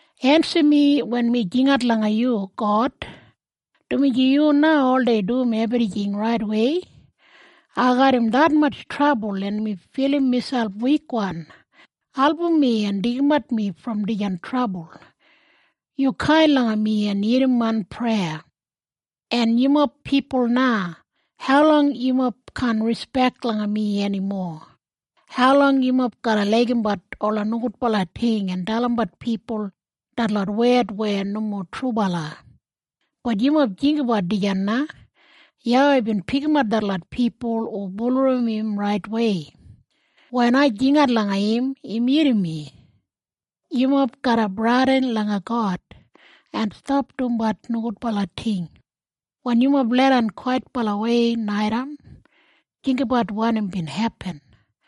Ensim mi wen mi jingat langa yu, God, dumaji yu na oldei dum ebrijing raitwei. Ai garram detmatj trabul en mi filim miselp wikwan. Album mi en deigimat mi brom dijan trabul. Yu kain langa mi en irrim main preya. En yumob pipul na. Haulong yumob kaan rispek langa mi eni mowa? Haulong yumob garra laigimbat ola nogudbala ting, en dalimbat pipul detlot wed weya nomo trubala? Bat yumob jinggabat dijan na! YAWEI bin pikimat detlot pipul hu bulurrum im raitwei. Wen ai jingat langa im, im irrim mi. Yumob garra bradin langa God, en stap dumbat nogudbala ting. Wen yumob leidan kwaitbalawei naitaim, jinggabat wanim bin hepin,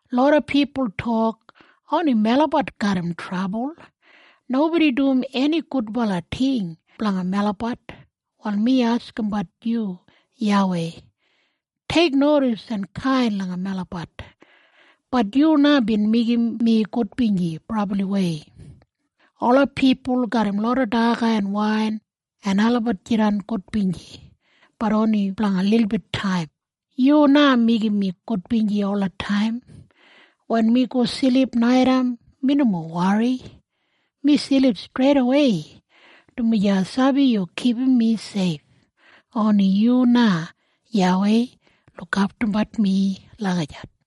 Loda pipul tok, “Oni melabat garram trabul. Nobodi dum eni gudbala ting blanga melabat!” Wal mi askimbat yu, YAWEI. Teiknodis en kain langa melabat. Bat yu na bin meigim mi gudbinji brabliwei. Ola pipul garram loda daga en wain en olabat jidan gudbinji, bat oni blanga lilbit taim. Yu na meigim mi gudbinji olataim! Wen mi go silip naitaim mi nomo wori. Mi silip streidawei, dumaji ai sabi yu kipum mi seif. Oni yu na, YAWEI, lukaftumbat mi lagijat.